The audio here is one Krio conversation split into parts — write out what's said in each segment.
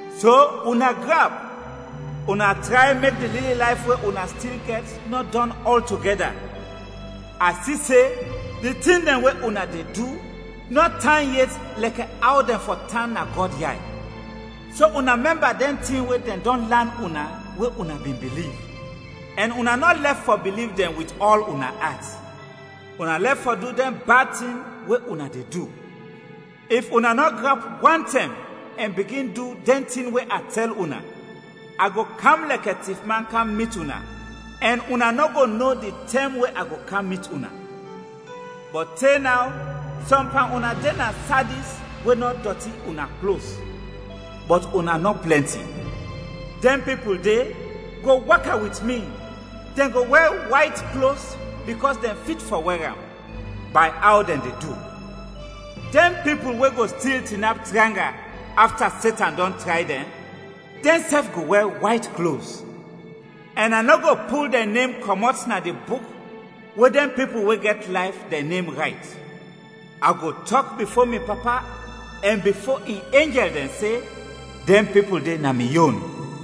So una grap, una tray mek di lili layf we una stil gɛt nɔ dɔn ɔltogɛda. A si se di tin dɛn we una de du nɔ tan yet lɛkɛ aw dɛn fɔ tan na Gɔd yay. So una mɛmba dɛn tin we dɛn dɔn lan una we una bin biliv, ɛn una nɔ lɛf fɔ biliv dɛn wit ɔl una at, una lɛf fɔ du dɛn bad tin we una de du. If una nɔ grap wantɛm ɛn bigin du dɛn tin we a tɛl una, a go kam lɛkɛ tifman kam mit una ɛn una nɔ go no di tɛm we a go kam mit una. Bɔt te naw sɔm pan una de na Sadis we nɔ dɔti una klos, bɔt una nɔ plɛnti. Dɛn pipul de go waka wit mi, dɛn go wɛr wayt klos bikɔs dɛn fit fɔ wɛr am, bay aw dɛn de du. Dɛn pipul we go stil tinap tranga afta Setan dɔn tray dɛn, dɛnsɛf go wɛr wayt klos. Ɛn a nɔ go pul dɛn nem kɔmɔt na di buk we dɛn pipul we gɛt layf, dɛn nem rayt. A go tɔk bifo mi Papa ɛn bifo in enjɛl dɛn se dɛn pipul de na mi yon.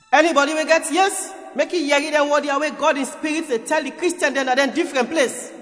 “Ɛnibɔdi we gɛt yes, mek i yɛri dɛn wɔd ya we Gɔd in Spirit de tɛl di Kristiɛn dɛn na dɛn difrɛn ples.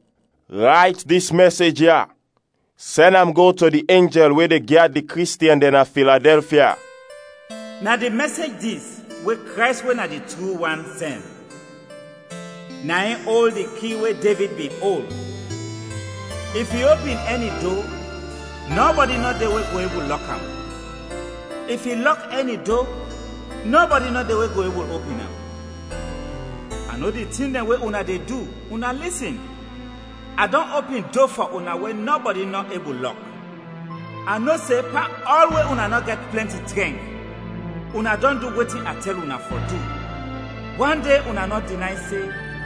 “Rayt dis mɛsej ya sɛn am go to di enjɛl we de gyad di Kristiɛn dɛn na Filadɛlfia: “Na di mɛsej dis we Krays we na di tru wan, sɛn. Na in ol di ki we Devid bin ol. If i opin ɛni do, nɔbɔdi nɔ de we go ebul lɔk am. If i lɔk ɛni do, nɔbɔdi nɔ de we go ebul opin am: A no di tin dɛn we una de du. Una lisin, a dɔn opin do fɔ una we nɔbɔdi nɔ ebul lɔk. A no se pan ɔl we una nɔ gɛt plɛnti trɛnk una dɔn du wetin a tɛl una fɔ du, wande una nɔ dinay se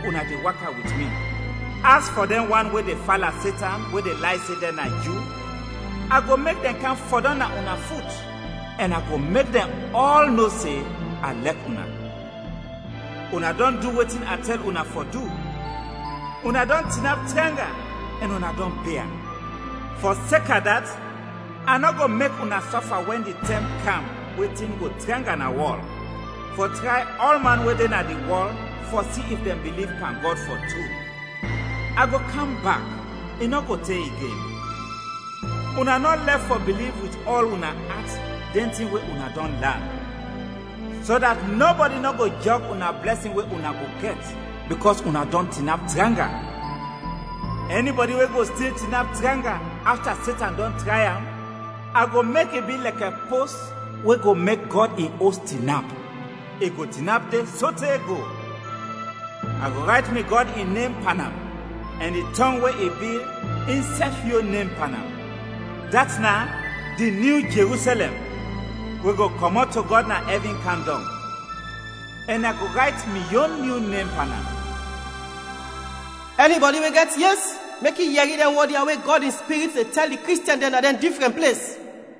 una de waka wit mi. As fɔ dɛn wan we de fala Setan, we de lay se dɛn na Ju, a go mek dɛn kam fɔdɔm na una fut ɛn a go mek dɛn ɔl no se a lɛk una. Una dɔn du wetin a tɛl una fɔ du una dɔn tinap tranga ɛn una dɔn bia; fɔseka dat a nɔ go mek una sɔfa wɛn di tɛm kam we tin go tranga na wɔl, fɔ tray ɔlman we de na di wɔl fɔ si if dɛn biliv pan Gɔd, fɔ tru. A go kam bak, i nɔ go te igen. Una nɔ lɛf fɔ biliv wit ɔl una at dɛn tin we una dɔn lan, so dat nɔbɔdi nɔ go jɔg una blɛsin we una go gɛt bikɔs una dɔn tinap tranga. Ɛnibɔdi we go stil tinap tranga afta Setan dɔn tray am, a go mek i bi lɛkɛ pos we go mek Gɔd in Os tinap, i go tinap de sote go. A go rayt mi Gɔd in nem pan am, ɛn di tɔng we i bil, in sɛf yon nem pan am, dat na ‘di Nyu Jerusɛlɛm’, we go kɔmɔt to Gɔd na ɛvin kam dɔng. Ɛn a go rayt mi yon nyu nem pan am. “Ɛnibɔdi we gɛt yes, mek i yɛri dɛn wɔd ya we Gɔd in Spirit de tɛl di Kristiɛn dɛn na dɛn difrɛn ples.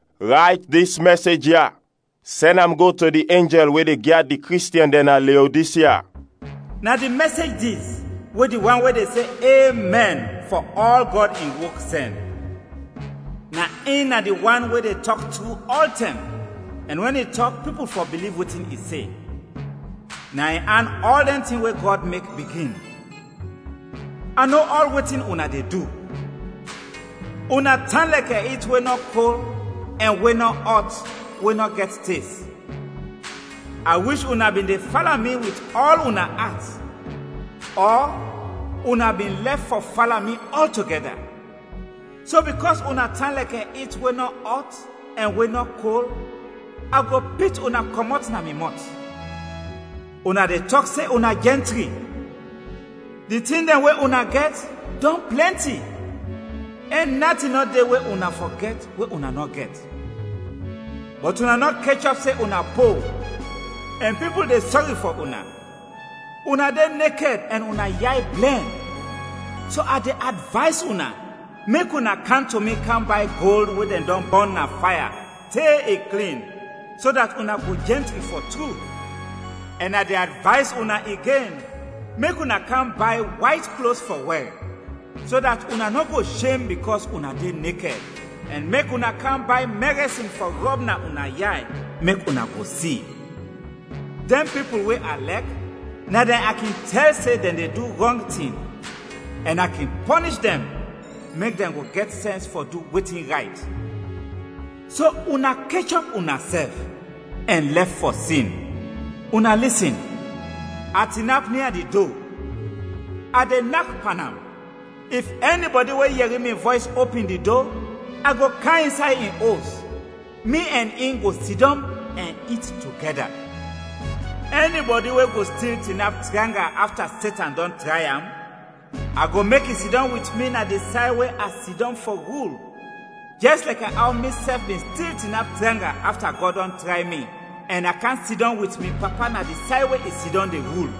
“Rayt dis mɛsej ya sɛn am go to di enjɛl we de gyad di Kristiɛn dɛn na Leodisya: “Na di mɛsej dis we di wan we de se ‘Emɛn’ fɔ ɔl Gɔd in wok, sɛn. Na in na di Wan we de tɔk tru ɔltɛm ɛn wɛn i tɔk pipul fɔ biliv wetin i se, na in an ɔl dɛn tin we Gɔd mek, bigin: A no ɔl wetin una de du. Una tan lɛkɛ it we nɔ kol ɛn we nɔ ɔt we nɔ gɛt tes. A wish una bin de fala mi wit ɔl una at ɔ una bin lɛf fɔ fala mi ɔltogɛda. So bikɔs una tan lɛkɛ it we nɔ ɔt ɛn we nɔ kol, a go pit una kɔmɔt na mi mɔt. Una de tɔk se una jɛntri, di tin dɛn we una gɛt, dɔn plɛnti, ɛn natin nɔ de we una fɔ gɛt we una nɔ gɛt. Bɔt una nɔ kechɔp se una po, ɛn pipul de sɔri fɔ una, una de nekɛd ɛn una yay blɛn. So a de advays una mek una kam to mi kam bay gold, we dɛn dɔn bɔn na faya te i klin so dat una go jɛntri fɔ tru; ɛn a de advays una igen mek una kam bay wayt klos fɔ wɛr, so dat una nɔ go shem bikɔs una de nekɛd, ɛn mek una kam bay mɛrɛsin fɔ rɔb na una yay mek una go si. Dɛn pipul we a lɛk na dɛn a kin tɛl se dɛn de du rɔng tin ɛn a kin pɔnish dɛn mek dɛn go gɛt sɛns fɔ du wetin rayt. So una kechɔp unasɛf, ɛn lɛf fɔ sin. Una lisin, a tinap nia di do, a de nak pan am; if ɛnibɔdi we yɛri mi vɔys opin di do, a go kam insay in os, mi ɛn in go sidɔm ɛn it togɛda. Ɛnibɔdi we go stil tinap tranga afta Setan dɔn tray am, a go mek i sidɔm wit mi na di say we a sidɔm fɔ rul jɛs lɛkɛ aw misɛf bin stil tinap tranga afta Gɔd dɔn tray mi ɛn a kam sidɔm wit mi Papa na di say we i sidɔm de rul.